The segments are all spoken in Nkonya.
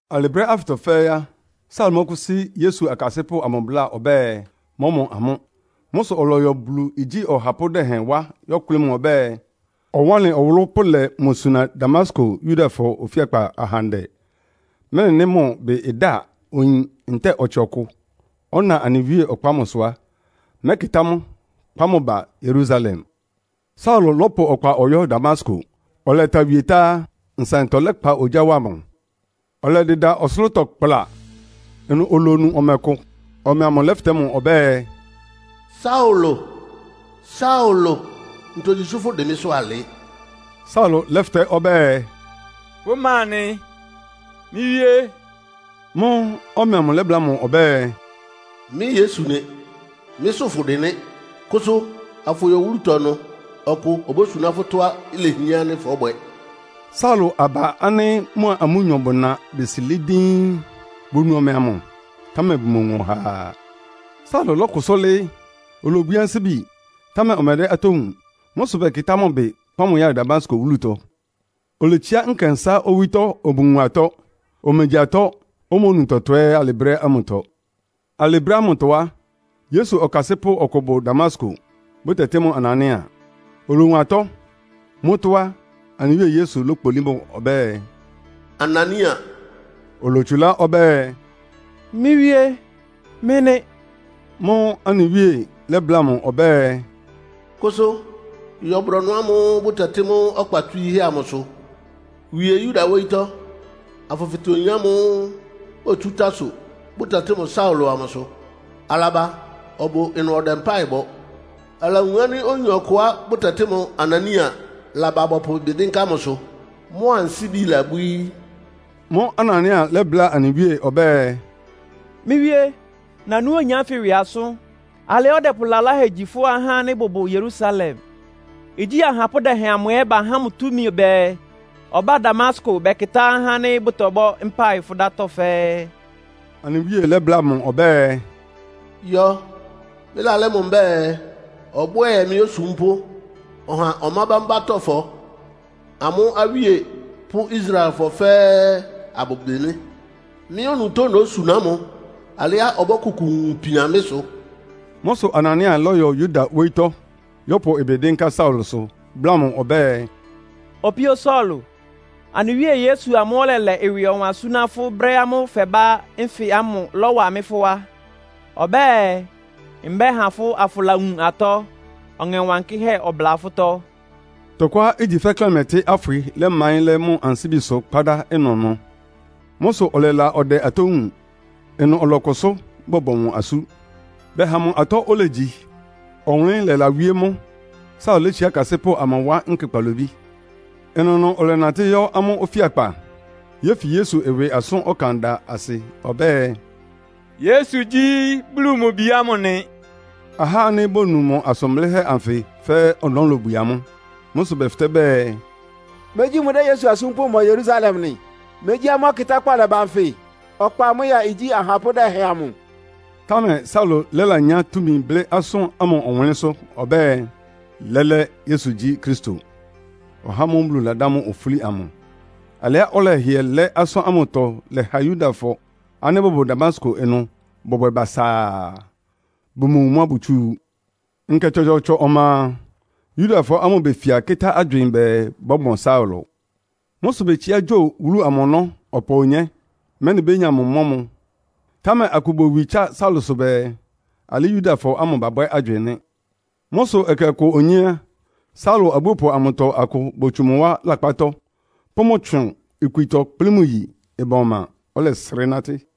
Alɩ brɛ́ ánfɩtɔ fɛ́ɛ́ á, Saulo mɔ́kʋ́sí Yesu akasɩ́pʋ́ amʋ bláa ɔbɛ́ɛ, mɔ́mɔ amʋ́. Mʋ́ sʋ ɔlɔyɔ Bulu igyí ɔhapʋ́ dɛhɛn wá yɔ́kʋlɩ́ mʋ ɔbɛ́ɛ, ɔwánlɩn ɔwʋlʋ́ pʋlɛ mʋ suna Damasko Yudafɔ ofíakpa ahandɛ, mɛ́nɩ nɩ́ mʋ ɩbɩ da oyin ntɛ́ɛ ɔtsɩ ɔkʋ, ɔna anɩ Wíe ɔkpa ámʋsʋ a, mɛ́kɩtá mʋ, kpá mʋ ba Yerusalem. Saulo lɔ́pʋ ɔkpa ɔyɔ́ Damasko. Ɔlɛta wie tá á, nsaɩntɔ lɛkpa ogyá wa mʋ. Ɔlɛdɩda ɔsʋlʋ́tɔ kpla. Ɩnʋ olonu ɔmɛ kʋ. Ɔmɛ amʋ lɛ́fɩtɛ́ mʋ ɔbɛ́ɛ, “Saulo, Saulo, ntogyi sʋ́ fʋ́dɩn mɩ́sʋ́ alɩ?” Saulo lɛ́fɩtɛ́ ɔbɛ́ɛ, “Fʋ́ ma nɩ, mɩ́ Wíé?” Mʋ́ʋ́ ɔmɛ amʋ lɛ́bláa mʋ ɔbɛ́ɛ, “Mɩ́ Yesu nɩ. Mɩ́sʋ́ fʋdɩn nɩ́. Kʋsʋ, afʋyɔ wúlutɔ ɩnʋ. Ɔkʋ obósuná fʋ́ tɔ́á lehián ánɩ́ fɔ́bwɛ.” Saulo aba ánɩ́ mʋa amʋ́nyɔ bʋna besi lɩ́ɩ́ díín. Bonu ɔmɛ amʋ, támɛ bʋmowun ɔhaa. Saulo lɔ́kʋsʋ́ lɩ́ɩ́. Olobwií ansíbi, támɛ ɔmɛdɛ́ atɔ́ wúun. Mʋ́ sʋ bɛkɩtá mʋ ɩbɩ, kpá mʋ ya Damasko wúlutɔ. Oletsiá nkɛnsá owítɔ́ omowun atɔ́. Omegyi atɔ́, omonu tɔtɔ ɛ́ alɩ brɛ́ ámʋtɔ. Alɩ brɛ́ ámʋtɔ á, Yesu ɔkasɩ́pʋ́ ɔkʋ bʋ Damasko, bʋtɛtɩ́ mʋ Anania. Olowun atɔ́. Mʋ́tɔ́ á, anɩ Wíe Yesu lókpolí mʋ ɔbɛ́ɛ, “Anania!” Olotsulá ɔbɛ́ɛ, “Mɩ́ Wíé, mɩ́ nɩ́.” Mʋ́ʋ́ anɩ Wíe lɛ́bláa mʋ ɔbɛ́ɛ, “Kʋsʋ, yɔ brɔnʋ ámʋ́ʋ́ bʋtɛtɩ́ mʋ́ ‘Ɔkpa Tswííhɛ́’ amʋsʋ. Wie Yuda wóyítɔ́, afʋfɩtɛ oyin ámʋ́ʋ́ otsú Tarso, bʋtɛtɩ́ mʋ Saulo amʋsʋ. Alaba, ɔbʋ ɩnʋ ɔdɛ mpáɩ bɔ. Alawun ánɩ́ oyin ɔkʋá bʋtɛtɩ́ mʋ Anania laba bɔpʋ ɩbɩ dɩ́nká mʋsʋ, mʋ ansíbi labwíí.” Mʋ́ʋ́ Anania lɛ́bláa anɩ Wíe ɔbɛ́ɛ, “Mɩ́ Wíé, nanú oyin ánfɩ ɩwɩ asʋ́n. Alɩá ɔdɛpʋ lalahɛ gyi fʋ́ ahá ánɩ́ bʋbʋ Yerusalem. Igyí ahapʋ́ dɛhɛn amʋ ɛ́ bahá mʋ túmi bɛɛ, ɔbá Damasko bɛkɩtá ahá ánɩ́ bʋtɔbɔ́ mpáɩ fʋ́ dátɔ́ fɛ́ɛ́.” Anɩ Wíe lɛ́bláa mʋ ɔbɛ́ɛ, “Yɔ, mɩ́lalɛ́ mʋ mbɛ́ɛ, ɔbwɛ́ɛ mɩ́ osúmpʋ́, ɔha ɔmá bámbátɔ́fɔ, amʋ́ awíe pʋ́ Israelfɔ fɛ́ɛ́ abʋbɩ mɩ́. Mɩ́ onutó nósuná mʋ alɩá ɔbɔ́kʋkʋ wun ipian mɩ́ sʋ.” Mʋ́ sʋ Anania lɔ́yɔ Yuda wóyítɔ́, yɔ́pʋ ɩbɩ dɩ́nká Saulosʋ, bláa mʋ ɔbɛ́ɛ “Opíó Saulo, anɩ Wíe Yesu amʋ́ʋ́ ɔlɛlɛ ɩwɩ ɔwan súná fʋ́ brɛ́ ámʋ́ʋ́ fɛbá nfɩ ámʋ láwá mɩ́ fʋ́ wá. Ɔbɛ́ɛ, mbɛha fʋ́ afʋlawun atɔ́, Ɔŋɛ Wankɩ́hɛ́ ɔbʋla fʋ́tɔ́.” Tɔkʋá igyi fɛ́ klɛmɛtɩ́ afwɩ lɛ́maɩ́n lɛ́ mʋ ansíbisʋ kpádá ɩnʋnʋ. Mʋ́ sʋ ɔlɛla ɔdɛ atɔ́ wúun. Ɩnʋ ɔlɔkʋsʋ́, bɔbɔ mʋ asú. Bɛha mʋ atɔ́ olegyi, ɔwʋnlɩ́n lɛlawíé mʋ. Saulo létsiá akasɩ́pʋ́ amʋ wá nkɛ kpalobí. Ɩnʋnʋ ɔlɛnatɩ́ yɔ́ amʋ́ ofíakpa, yéfi Yesu ɩwɩ asʋ́n ɔkan da asɩ ɔbɛ́ɛ, “Yesu gyí Bulu mʋ bi ámʋ nɩ.” Ahá ánɩ́ bonu mʋ asʋn blɩ́hɛ́ anfɩ fɛ́ɛ́ ɔnɔ́ lobwie amʋ́. Mʋ́ sʋ bɛfɩtɛ́ bɛɛ, “Megyí mʋdɛ́ Yesu asúmpʋ́ mɔ Yerusalem nɩ? Megyí amʋ́ ɔkɩtákpá ɔlɛba nfɩ, ɔkpa amʋ́ ya igyí ahapʋ́ dɛhɛn amʋ?” Támɛ Saulo lɛ́lanyá túmi blɩ́ asʋ́n ámʋ ɔwʋnlɩ́nsʋ́ ɔbɛ́ɛ, lɛ́lɛ́ Yesu gyí Kristo, (ɔhá ámʋ́ʋ́ Bulu ladá mʋ ofúli amʋ). Alɩá ɔlɛhɩɛ lɛ́ asʋ́n ámʋtɔ lɛha Yudafɔ ánɩ́ bʋbʋ Damasko ɩnʋ bɔbwɛ basaa. Bʋmowun mʋ́á bótsu. Nkɛ tsɔtsɔɔtsɔ ɔma a, Yudafɔ ámʋ befia kɩ́tá agywɩɩn bɛɛ bɔ́mɔ Saulo. Mʋ́ sʋ betsiá gyo wúlu amʋ ɔnɔ́ ɔpa onyé, mɛ́nɩ bénya mʋ mɔ́ mʋ. Támɛ akʋ bowi tsá Saulosʋ bɛɛ, alɩ́ Yudafɔ ámʋ babwɛ́ agywɩɩn nɩ́. Mʋ́ sʋ ɛkɛ ɔkʋ onyé á, Saulo abúopʋ amʋtɔ akʋ botsu mʋ wá lakpátɔ́, pʋ́ mʋ tsʋn ikwitɔ kplɩ́ mʋ yi ɩban ɔma, ɔlɛsrɩ́ nátɩ́.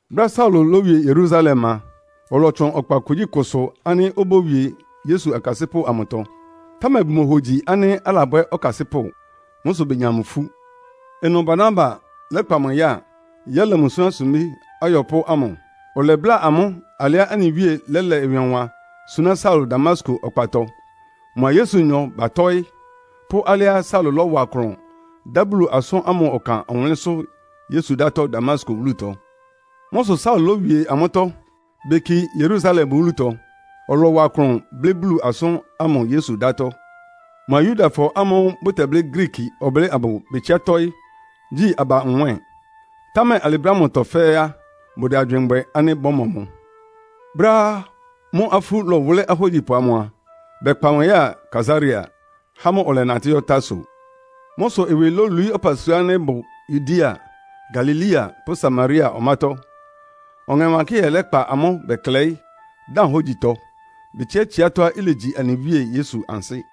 Brɛ́á Saulo lówie Yerusalem a, ɔlɔtsʋn ɔkpa kugyíkʋsʋ ánɩ́ obówie Yesu akasɩ́pʋ́ amʋtɔ. Támɛ bʋmohogyi ánɩ́ alabwɛ́ ɔkasɩ́pʋ́. Mʋ́ sʋ benya mʋ ifú. Ɩnʋ Barnaba lɛ́kpa mʋ ya, yɛ́lɛ mʋ súná sumbí ayɔpʋ́ amʋ. Ɔlɛbláa amʋ́ alɩá anɩ Wíe lɛ́lɛ ɩwɩ ɔwan súná Saulo Damasko ɔkpatɔ, mʋa Yesunyɔ batɔ́ɩ́; pʋ́ alɩá Saulo lɔ́wa klʋn dá Bulu asʋ́n ámʋ ɔkan ɔwʋnlɩ́nsʋ́ Yesu dátɔ́ Damasko wúlutɔ. Mʋ́ sʋ Saulo lówie amʋ́tɔ́, beki Yerusalem wúlutɔ. Ɔlɔwa klʋn blɩ́ Bulu asʋ́n ámʋ Yesu dátɔ́. Mʋa Yudafɔ ámʋ́ʋ́ bʋtɛblɩ́ Griiki ɔblɩ́ɩ amʋ betsiá tɔ́ɩ́, gyi aba nwɛ́ɛn. Támɛ alɩ brɛ́ ámʋtɔ fɛ́ɛ́ á, bʋdɛ agywɩɩn bwɛ ánɩ́ bɔ́mɔ mʋ. Brɛ́á mʋ́ afú lɔwʋlɩ́ ahógyipʋ amʋ a, bɛkpa mʋ yáa Kaesarea, há mʋ ɔlɛnatɩ́ yɔ́ Tarso. Mʋ́ sʋ ɩwɩ lolwií ɔpasua ánɩ́ bʋ Yudea, Galilea pʋ́ Samaria ɔmátɔ́. Ɔŋɛ Wankɩ́hɛ́ lɛ́kpa amʋ́ bɛklɛɩ́, dan hógyitɔ, betsiá tsiátɔ́á ilegyi anɩ Wíe Yesu ansɩ́.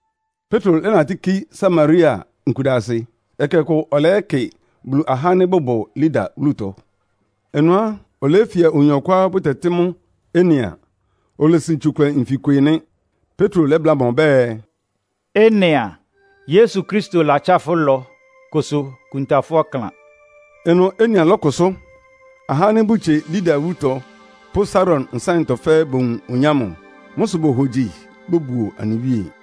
Petro lɛ́natɩ́ ki Samaria nkudasɩ. Ɛkɛ ɔkʋ ɔlɛyɛ́kɩ Bulu ahá ánɩ́ bʋbʋ Lida wúlutɔ. Ɩnʋ á, oleyéfia oyin ɔkʋá bʋtɛtɩ́ mʋ Enea, olesin tsukʋlɛ nfikwe nɩ́. Petro lɛ́bláa mʋ ɔbɛ́ɛ, “Enea, Yesu Kristo latsá fʋ́ ɩlɔ. Kʋsʋ kunta fʋ́ ɔklan.” Ɩnʋ Enea lɔ́kʋsʋ́. Ahá ánɩ́ bʋtsie Lida wúlutɔ pʋ́ Saron nsáɩntɔ fɛ́ɛ́ bowun oyin ámʋ. Mʋ́ sʋ bohogyi, bobuo anɩ Wíe.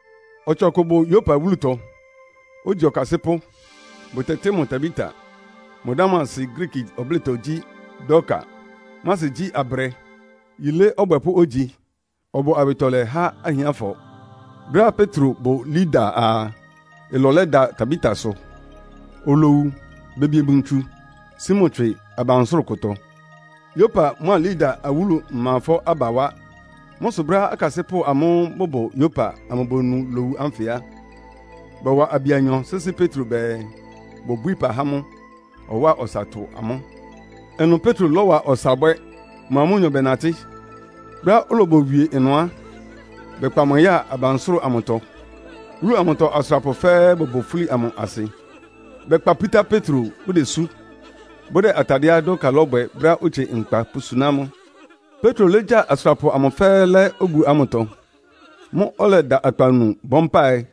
Ɔtsɩ ɔkʋ bʋ Yopa wúlutɔ, ogyi ɔkasɩ́pʋ́. Bʋtɛtɩ́ mʋ Tabita. Mʋ dá ámʋ asɩ Griiki ɔblɩ́tɔ gyí, “Dorka.” Mʋ́ asɩ gyí, “Abrɛ.” Yilé ɔbwɛpʋ́ ogyi. Ɔbʋ awɩtɔlɛ há ahiánfɔ. Brɛ́á Petro bʋ Lida a, ɩlɔ lɛda Tabitasʋ. Olowu, bebie mʋ ntsu, sí mʋ tswɩ abansʋ́rʋ kʋtɔ. Yopa mʋ́a Lida awúlu ɩmafɔ́ aba wá. Mʋ́ sʋ brɛ́á akasɩ́pʋ́ amʋ́ʋ́ bʋbʋ Yopa amʋ bonu lowu ánfɩ á, bɔwa abi anyɔ sɩ́sɩ́ Petro bɛɛ, bobwíí ɩpa há mʋ, ɔwáa ɔsa tʋ amʋ́. Ɩnʋ Petro lɔ́wa ɔsa bwɛ́, mʋ́a amʋ́nyɔ bɛnatɩ́. Brɛ́á olobowie ɩnʋ á, bɛkpa mʋ ya abansʋ́rʋ amʋtɔ. Wúlu amʋtɔ asʋrapʋ fɛ́ɛ́ bʋbʋ fúli amʋ asɩ. Bɛkpa pútá Petro bʋdesú, bʋdɛ atadɩɛá Dorka lɔ́bwɛ brɛ́á otsie nkpa pʋsúná mʋ. Petro légya asʋrapʋ amʋ fɛ́ɛ́ lɛ́ obu ámʋtɔ. Mʋ́ʋ́ ɔlɛda akpawunu bɔ́ mpáɩ,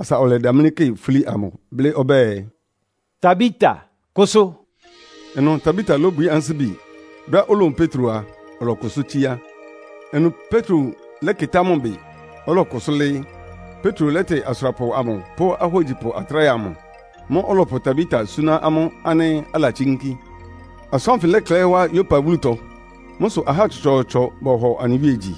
asa ɔlɛdamlɩ́ kɩ fúli amʋ blɩ́ ɔbɛ́ɛ, “Tabita, kʋsʋ.” Ɩnʋ Tabita lóbwií ansíbi. Brɛ́á olowun Petro a, ɔlɔkʋsʋ́ tsíá. Ɩnʋ Petro lɛ́kɩtá mʋ bɩ, ɔlɔkʋsʋ́ lɩ́ɩ́. Petro lɛ́tɩ asʋrapʋ amʋ pʋ́ ahógyipʋ atráhɛ amʋ. Mʋ́ʋ́ ɔlɔpʋ Tabita súná amʋ́ ánɩ́ alatsínkí. Asʋ́n ánfɩ lɛklɛɩ́ wá Yopa wúlutɔ. Mʋ́ sʋ ahá tsɔtsɔɔtsɔ bɔhɔ anɩ Wíe gyi.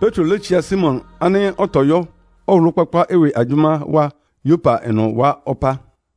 Petro létsiá Simon ánɩ́ ɔtɔyɔ́ ɔwʋlʋ́-kpákpá ɩwɩ agyʋ́má wá Yopa ɩnʋ wá ɔpá.